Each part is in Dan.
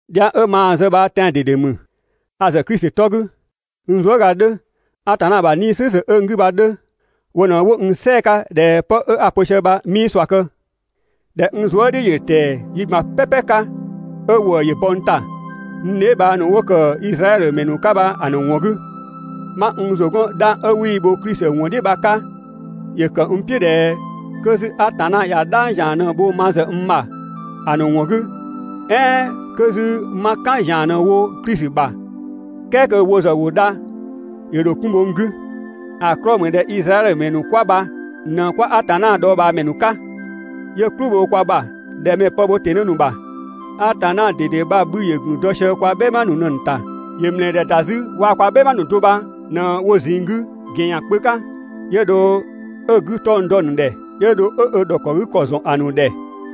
Dhiang 'ö maa‑ zë bha tɛan‑ ꞊dede ‑mü, a‑ ‑zë Klisi 'tɔ 'gü, n zuëga 'dhö, Atanna ‑bha 'Nii‑ "slʋ̈ʋ̈slʋ̈ 'ö n 'gü bha‑ 'dhö, wo ꞊në 'wo n "sɛɛ‑ 'ka ꞊dhɛ 'pë 'a‑ pö sië bha 'mii ꞊sua kë. ꞊Dhɛ n zuë" "dhiʋ̈ ‑yö ‑tɛɛ yi ꞊gban "pɛpɛ 'ka 'ö ‑wëë ‑yö bɔ n ‑ta, n dheebhang ‑nu 'wo ‑kë Izraɛdhö ‑mɛ ‑nu 'ka bha‑ ‑nu ‑wɔn 'gü. 'Ma n ‑zʋ 'gɔn 'dhang 'ö 'wii‑ bho Klisi ‑wɔn "dhiʋ̈ bha‑ 'ka, ‑yö ‑kë n "piʋ̈ ꞊dhɛ 'kö 'zü Atanna ꞊ya "dhang ‑zian ꞊në‑ bho ma ‑zë n ‑bha ‑a ‑nu ‑wɔn 'gü, "ɛɛn 'kö 'zü 'ma "kan ‑zian ꞊në‑ wo Klisi ‑bha, "kɛɛ kö wo ‑zë ‑wo dha, ‑yö ‑dho 'kun bho n 'gü. ‑A 'klɔɔ‑ ‑mü ꞊dhɛ Izraɛdhö ‑mɛ ‑nu 'kwa bha ꞊në 'kwa Atanna dhɔɔbhaamɛ ‑nu 'ka, 'yö "klʋ bho kwa ‑bha ꞊dhɛ mɛ‑ pë bho ‑tɩnë ‑nu ‑bha. Atanna ꞊dede bha‑ 'bhü ‑yö ‑gun dɔ sië kwa "bhɛma ‑nu ꞊në‑ ‑nu ‑ta. ‑Yö ‑mlɛɛdhɛ ‑da 'zü waa‑ kwa "bhɛma ‑nu do bha ꞊në‑ ‑nu ꞊zinng 'gü ‑gɛn ‑yan kpö 'ka, 'yö dho 'ö‑ 'gü 'tɔng‑ dɔ‑ ‑nu ‑dhɛ, 'yö dho 'ö ö ‑dhɔkë ‑kɔ ‑zɔn ‑a ‑nu ‑dhɛ,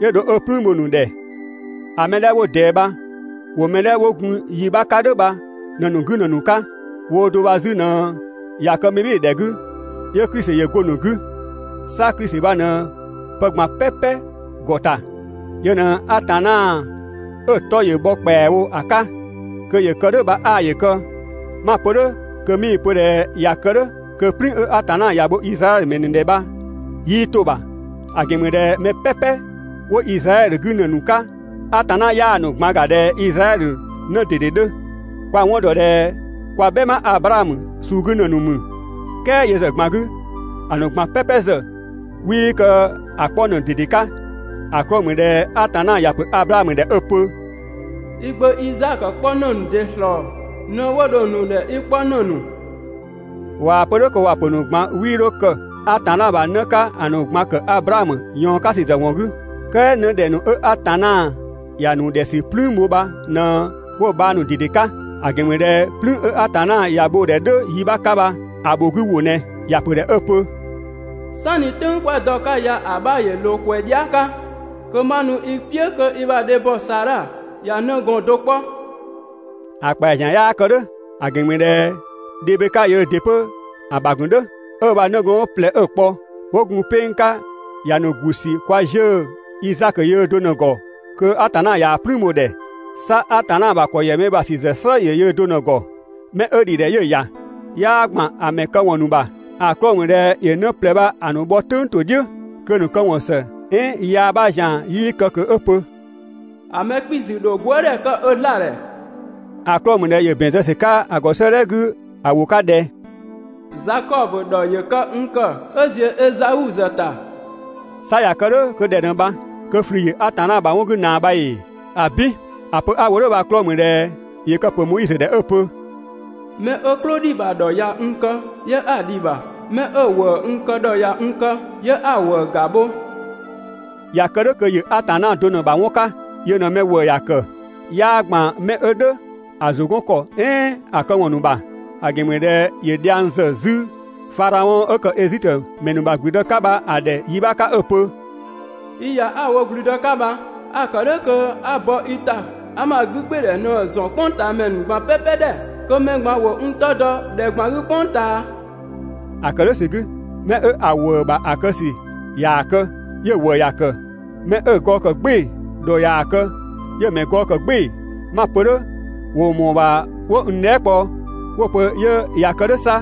'yö dho 'ö "plüün bho‑ ‑nu ‑dhɛ. ‑A mɛ 'dhɛ 'wo ꞊dɛɛ bha ‑wo mɛ 'dhɛ 'wo gun yi 'bha 'ka "dhʋ̈ bha ꞊në‑ ‑nu 'gü ‑në ‑nu 'ka. Woo do bha 'zü ꞊në ꞊ya kë mɛbhɩɩdhɛ 'gü, 'yö Klisi ‑yö go‑ ‑nu 'gü. 'Sa Klisi bha ꞊në pë ꞊gban "pɛpɛ ‑gɔ ‑ta, yö ꞊në Atanna 'ö‑ 'tɔ ‑yö bhɔ ‑kpɛawo ‑a 'ka. Kö ‑yö kë "dhʋ̈ bha 'aa ‑yö kë! 'Ma‑ pö "dhʋ̈ kö 'mii‑ pö ꞊dhɛ ꞊ya kë "dhʋ̈ kö "plüün 'ö Atanna ‑ya bho Izraɛdhö ‑mɛ ‑nu ‑dhɛ bha 'yii 'to‑ ‑bha, ‑a ‑gɛn ‑mü ꞊dhɛ mɛ "pɛpɛ 'wo Izraɛdhö 'gü ‑në ‑nu 'ka, Atanna 'yaa‑ ‑nu ꞊gban ‑ga ꞊dhɛ Izraɛdhö 'në ꞊dede 'dhö. Kwa‑ 'wɔn ‑dɔ ꞊dhɛ kwa "bhɛma Ablaamö suu 'gü ‑në ‑nu ‑mü, "kɛɛ yö ‑zë ꞊gban 'gü, ‑a ‑nu ꞊gban "pɛpɛ ‑zë 'wii kë ‑a 'kpɔ ‑në ꞊dede 'ka. ‑A 'klɔɔ‑ ‑mü ꞊dhɛ Atanna ‑ya ‑pö Ablaamö ‑dhɛ 'ö‑ pö: «I gbö Izaakö 'kpɔ ‑në ‑nu ‑dɩ ‑slɔɔ ꞊në 'wo dho‑ ‑nu ‑dhɛ i 'kpɔ ‑në ‑nu.» ꞊Waa‑ pö "dhʋ̈ kö ‑wa pö‑ ‑nu ꞊gban 'wii 'dho kë Atanna ‑bha 'në 'ka ‑a ‑nu ꞊gban ‑kë Ablaamö ꞊yɔɔn 'ka ‑sü ‑wɔn ‑zë 'gü, "kɛɛ 'në ‑dhɛ ‑nu 'ö Atanna ‑ya ‑nu ‑dhɛ ‑sü "plüün bho bha ꞊në 'wo‑ bhang ꞊dede ‑nu 'ka. ‑A ‑gɛn ‑mü ꞊dhɛ "plüün 'ö Atanna ‑ya bho‑ ‑dhɛ "dhʋ̈ yi 'bha 'ka bha, ‑a ‑bho 'gü ‑wʋ ꞊nɛ. ‑Ya ‑pö ‑dhɛ 'ö‑ pö: «"Sanni "tʋ̈ng 'kwa dɔ‑ 'ka ya ‑a 'bha ‑yö ꞊loo ‑kwɛ dhia" 'ka, kö ma nu i "piʋ̈ kö i ‑bha dhebhɔ Saadha ꞊ya 'nëgɔɔn do 'kpɔ.» ‑A ‑kpɛa ‑zian 'yaa kë "dhʋ̈, ‑a ‑gɛn ‑mü ꞊dhɛ Dhebeka yöö ‑dɩ 'pö‑ ‑bha ‑gun "dhʋ̈. 'Ö ö ‑bha 'nëgɔɔn ꞊plɛ 'ö‑ kpɔ, 'wo gun 'peng 'ka bha ‑ya ‑nu ‑gu ‑sü kwa 'ziʋ̈‑ Izaakö yöö do ꞊në‑ ‑gɔ kö Atanna ꞊yaa‑ "plüün bho‑ ‑dhɛ. 'Sa Atanna ‑bha ‑kɔ ‑yɛ mɛ ‑bha ‑sü ‑zë "slë ‑yö yöö do ꞊në‑ ‑gɔ. 'Mɛ 'ö ‑dhi ‑dhɛ 'yö‑ ‑ya, 'yaa ‑gban ‑a ‑mɛ këwɔn ‑nu ‑bha. ‑A 'klɔɔ‑ ‑mü ꞊dhɛ ‑yö 'në ꞊plɛ bha‑ ‑nu bhɔ "tʋ̈ng ‑to "dhiʋ̈ kö‑ ‑nu këwɔn ‑së "ɛɛn yaa 'bha ‑zian 'yii kë ꞊kö 'ö‑ pö: «‑A mɛ 'kpiisü ‑dho gwëëdhɛ kë ö 'zlaa‑ ‑dhɛ.» ‑A 'klɔɔ‑ ‑mü ꞊dhɛ ‑yö ‑bɛn zë ‑sü 'ka‑ ‑gɔ 'sëëdhɛ 'gü ‑a ‑wʋ 'ka ꞊dhɛ: «Zakɔbö ‑dhɔkë n ‑kë 'ö ‑ziö Ezau ‑zë ‑ta.» 'Sa ꞊ya kë "dhʋ̈ kö ꞊dhɛ ꞊në bha? 'Kö ꞊flü ‑yö Atanna ‑bha 'wɔn 'gü ꞊naa bha ‑ee? ‑Abin! ‑A pö 'a‑ wo "dhʋ̈ bha‑ 'klɔɔ‑ ‑mü ꞊dhɛ ‑yö kë‑ ‑pö Moizö ‑dhɛ 'ö‑ pö: «'Mɛ 'ö "klʋ ‑dhi ‑bha ‑dhɔ ꞊ya n kë, 'yö 'a‑ ‑dhi ‑bha. 'Mɛ 'ö‑ ‑wëë n kë ‑dhɔ ꞊ya n kë, 'yö 'a‑ ‑wëë ‑ga bho.» ꞊Ya kë "dhʋ̈ kö ‑yö Atanna do ꞊në‑ ‑bha 'wɔn 'ka, yö ꞊në mɛ ‑wëë ‑ya ‑kë. 'Yaa ‑gban mɛ 'ö "dhʋ̈ ‑a ‑zʋ 'gɔn ‑kɔ ‑nu "ɛɛn ‑a këwɔn ‑nu ‑bha. ‑A ‑gɛn ‑mü ꞊dhɛ ‑yö dhiang ‑zë 'zü Fadhaɔn 'ö ‑kë Ezitö ‑mɛ ‑nu ‑bha ‑gblüdë 'ka bha‑ ‑dhɛ yi 'bha 'ka 'ö‑ pö: «I ‑ya 'a‑ wo ‑gblüdë 'ka bha, a‑ ‑kë "dhʋ̈ kö 'a bɔ i ‑ta 'a ma 'gügbɩɩdhɛ ꞊në‑ ‑zɔn "kpʋngtaamɛ ‑nu ꞊gban "pɛpɛ ‑dhɛ, kö mɛ ꞊gban ‑wo n 'tɔ dɔ ‑dhɛ ꞊gban 'gü "kpʋng ꞊taa.» ‑A ‑kë "dhʋ̈ ‑sü 'gü, 'mɛ 'ö‑ ‑wëë ‑bha ‑a kë ‑dhɔ ꞊yaa‑ kë, 'yö‑ ‑wëë ‑ya ‑kë, 'mɛ 'ö‑ gɔɔ ‑kë "gbɩɩ‑ ‑dhɔ ꞊yaa‑ kë ‑ya ‑mɛ gɔɔ ‑kë "gbɩɩ‑. 'Ma‑ pö "dhʋ̈, ‑wo ‑mɔɔ ‑bha 'wo n dhɛɛ" kpɔ 'wo‑ pö 'yö ꞊ya kë "dhʋ̈ 'sa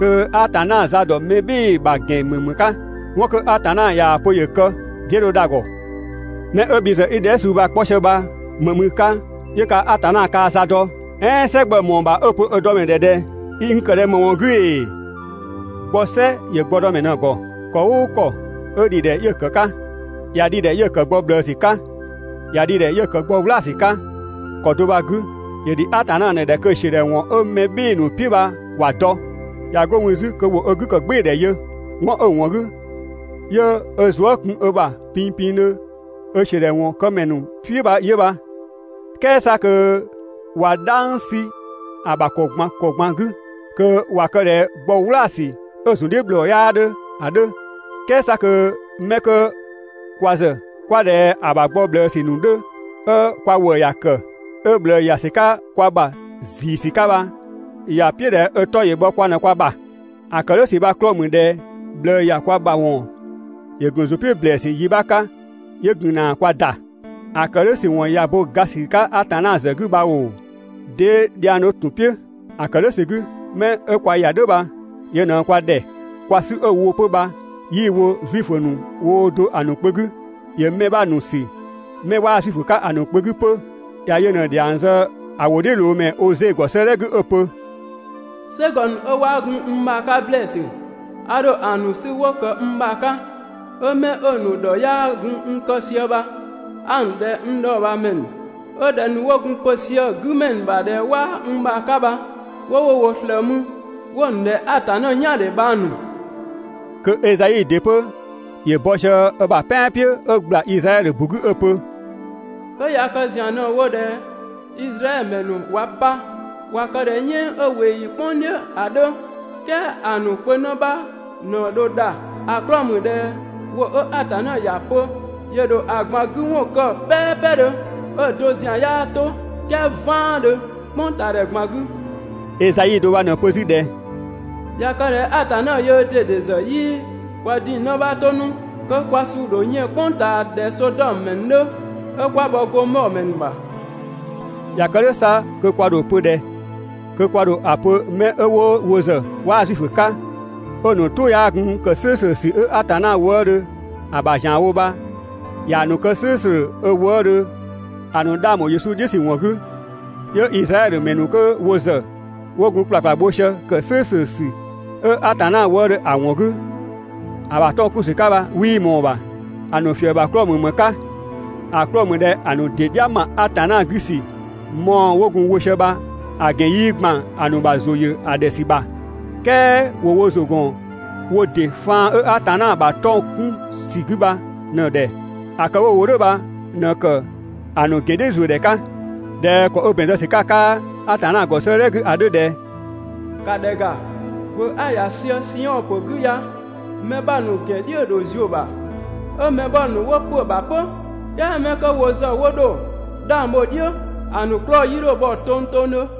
kö Atanna za ‑dɔ mɛ "bhɩɩ‑ ‑bha ‑gɛn ‑mü ‑më 'ka? 'Wɔn 'kö Atanna ꞊yaa‑ pö ‑yö kë, 'dee dho dha‑ ‑gɔ?» 'Mɛ 'ö bhi ‑zë 'i dhɛɛ" suu bha‑ 'kpɔ sië bha ‑më ‑mü i 'ka 'yö kaa‑ Atanna kaa za dɔ. "Ɛɛn "sɛ gbɔ‑ ‑mɔɔ ‑bha 'ö‑ pö ö dɔ ‑mɛ ‑dhɛ ꞊dhɛ: «I n kë ꞊ni ‑më ‑wɔn 'gü ‑ee?» Gbɔ "sɛ ‑yö gbɔdɔmɛ ꞊në‑ ‑gɔ. ‑Kɔ "ʋʋ ‑kɔ 'ö ‑dhi ‑dhɛ 'yö‑ ‑kë 'ka. ꞊Ya dhi‑ ‑dhɛ 'yö‑ ‑kë gbɔ ꞊bhlëësü 'ka, ꞊ya dhi‑ ‑dhɛ 'yö‑ ‑kë gbɔ "wlaasü 'ka. ‑Kɔ do bha‑ 'gü, ‑yö ‑dhi Atanna ꞊në‑ ‑dhɛ kö‑ ‑siödhɛwɔn 'ö mɛ "bhɩɩ‑ ‑nu "piʋ̈ bha ‑wa dɔ, ꞊ya 'go mü 'zü kö ‑wo ö 'gü ‑kë "gbɩɩdhɛ yö, 'wɔn 'ö‑ ‑wɔn 'gü 'yö ö zuë" kun ö ‑bha pinpindhö ö ‑siödhɛwɔn këmɛ ‑nu "piʋ̈ bha 'yö bha, "kɛɛ 'sa kö ꞊wa "dhang 'sü‑ ‑bha ‑kɔ ꞊gban ‑kɔ ꞊gban 'gü, kö ꞊wa kë ꞊dhɛ gbɔ "wlaasü 'ö‑ ‑zun "dhiʋ̈ ‑bhlɔɔ 'yaa 'dhö ‑a 'dhö. "Kɛɛ 'sa kö 'mɛ 'kö kwa ‑zë 'kwa ꞊dhɛ ‑a ‑bha gbɔ ꞊bhlëësü ‑nu 'dhö, 'ö kwa ‑wëë ‑ya ‑kë, 'ö ꞊bhlëë ‑ya ‑sü 'ka kwa ‑bha ‑ziisü 'ka bha ‑ya "piʋ̈ ꞊dhɛ ö 'tɔ ‑yö bhɔ kwa ꞊në kwa ‑bha. ‑A ‑kë "dhʋ̈ ‑sü bha‑ 'klɔɔ‑ ‑mü ꞊dhɛ ꞊bhlëë ‑ya kwa ‑bha ‑wɔn ‑yö ‑gun ‑zʋ "piʋ̈ ‑blɛɛsü yi 'bha 'ka 'yö gun ‑na kwa ‑da. ‑A ‑kë "dhʋ̈ ‑sü ‑wɔn ꞊ya bo ga ‑sü 'ka Atanna ‑zë 'gü bha ‑oo, 'dee dhiang 'dhö ‑tun "piʋ̈? ‑A ‑kë "dhʋ̈ ‑sü 'gü, 'mɛ 'ö kwa ‑ya "dhʋ̈ bha, yö ꞊në kwa ‑dhɛ, kwa 'sü 'ö‑ wo 'pö bha 'yii‑ wo Zuifö ‑nu woo do ‑a ‑nu kpö 'gü, ‑ya mɛ 'bha ‑nu ‑sü 'mɛ 'waa Zuifö 'ka‑ ‑nu kpö 'gü 'pö. ‑Ya yö ꞊në ‑dhiang zë ‑a ‑wʋdhiʋ̈loomɛ Oze ‑gɔ 'sëëdhɛ 'gü 'ö‑ pö: «"Sɛgɔ ‑nu 'ö 'waa gun n ‑bha 'ka ‑blɛɛsü, a ‑dho ‑a ‑nu 'sü 'wo ‑kë n ‑bha 'ka, 'ö mɛ 'ö‑ ‑nu ‑dhɔ 'yaa gun n kë sië bha, 'a‑ ‑nu ‑dhɛ n dhɔɔbhaamɛ ‑nu.» 'Ö ‑dhɛ ‑nu 'wo gun pö sië‑ 'gümɛ ‑nu ‑bha ꞊dhɛ 'waa n ‑bha 'ka bha, 'wo wo ‑wʋ ꞊slëë mü, 'wo‑ ‑nu ‑dhɛ Atanna "yaandhe bhang ‑nu.» Kö Ezai ‑dɩ 'pö ‑yö bɔ sië ö ‑bha "pɛan "piʋ̈ 'ö ‑gbla Izraɛdhö ‑bu 'gü 'ö‑ pö: «'Kö ꞊ya kë ‑zian ꞊në wo ꞊dhɛ Izraɛdhö ‑mɛ ‑nu ꞊wa pa, ꞊wa kë ꞊dhɛ "yɛɛn 'ö ꞊weeyi "kpʋng "dhiʋ̈ ‑a 'dhö, "kɛɛ ‑a ‑nu kpö 'në 'bha ꞊në dho dha. ‑A 'klɔɔ‑ ‑mü ꞊dhɛ ‑wʋ 'ö Atanna ‑ya pö ‑yö ‑dho ‑a ꞊gban 'gü ‑wɔn kë "pɛɛpɛdhö, 'ö‑ do ‑zian 'yaa 'to, "kɛɛ "vaandhö, "kpʋngtaadhɛ ꞊gban 'gü.» Ezai do bha ꞊në‑ pö 'zü ꞊dhɛ: «꞊Ya kë ꞊dhɛ Atanna yöö ꞊dede ‑zë 'yii kwa ‑ding 'në 'bha 'to 'nu, kö kwa suu ‑dho yën 'nu "kpʋng ꞊taa ꞊dhɛ Sodɔmö ‑mɛ ‑nu 'dhö, 'ö 'kwa bhɔ Gomɔɔ ‑mɛ ‑nu ‑bha.» ꞊Ya kë "dhʋ̈ 'sa kö kwa ‑dho ‑a pö ꞊dhɛ? Kö kwa ‑dho ‑a pö 'mɛ 'ö wo ‑zë 'waa Zuifö 'ka, 'ö‑ ‑nu "tʋ 'yaa gun ‑kë "slʋ̈ʋ̈slʋ̈ ‑sü 'ö Atanna wëëdhö ‑a ‑bha ‑zianwo bha ꞊yaa‑ ‑nu kë "slʋ̈ʋ̈slʋ̈ ö wëëdhö ‑a ‑nu 'dhang ‑bho Yesu "dhiʋ̈ ‑sü ‑wɔn 'gü 'Yö Izraɛdhö ‑mɛ ‑nu 'kö wo ‑zë 'wo gun ‑kplakpla bho sië ‑kë "slʋ̈ʋ̈slʋ̈ ‑sü 'ö Atanna wëëdhö ‑a ‑wɔn 'gü, ‑a ‑bha 'tɔng‑ 'kun ‑sü 'ka bha 'wii ꞊mɔɔ‑ ‑bha. ‑A ‑nu ‑fië ‑bha 'klɔɔ‑ ‑mü ‑më 'ka? ‑A 'klɔɔ‑ ‑mü ꞊dhɛ ‑a ‑nu ‑dɩ "dhia ‑ma Atanna 'gü ‑sü mɔɔ‑ 'wo gun‑ wo sië bha‑ ‑gɛn 'yii ‑gban ‑a ‑nu ‑bha ‑zʋ ‑yö ‑a ‑dhɛ ‑sü ‑bha, "kɛɛ ‑wo wo ‑zʋ ‑gɔn wo ‑dɩ faan 'ö Atanna ‑bha 'tɔng‑ 'kun ‑sü 'gü bha ꞊në‑ ‑dhɛ. ‑A kë 'wo‑ wo "dhʋ̈ bha ꞊në ‑kë ‑a ‑nu ‑gɛn "dhiʋ̈ ‑zuö ‑dhɛ 'ka. ꞊Dhɛ ‑kɔ 'ö ‑bɛn zë ‑sü 'ka‑ 'ka Atanna ‑gɔ 'sëëdhɛ 'gü ‑a 'dhö ꞊dhɛ: «‑Ka ‑dhɛ ‑ga, ‑gwë 'a‑ ‑ya sië Siɔn ‑pö 'gü ya, mɛ 'bha ‑nu ‑gɛn "dhiʋ̈ ‑dho ‑zuö ‑bha, 'ö mɛ 'bha ‑nu 'wo ‑pö ‑bha 'pö, "kɛɛ 'mɛ 'kö wo ‑zë 'wo dho 'dhang bho‑ "dhiʋ̈, ‑a ‑nu 'klɔɔ‑ 'yii 'dho bhɔ tongtongdhö.»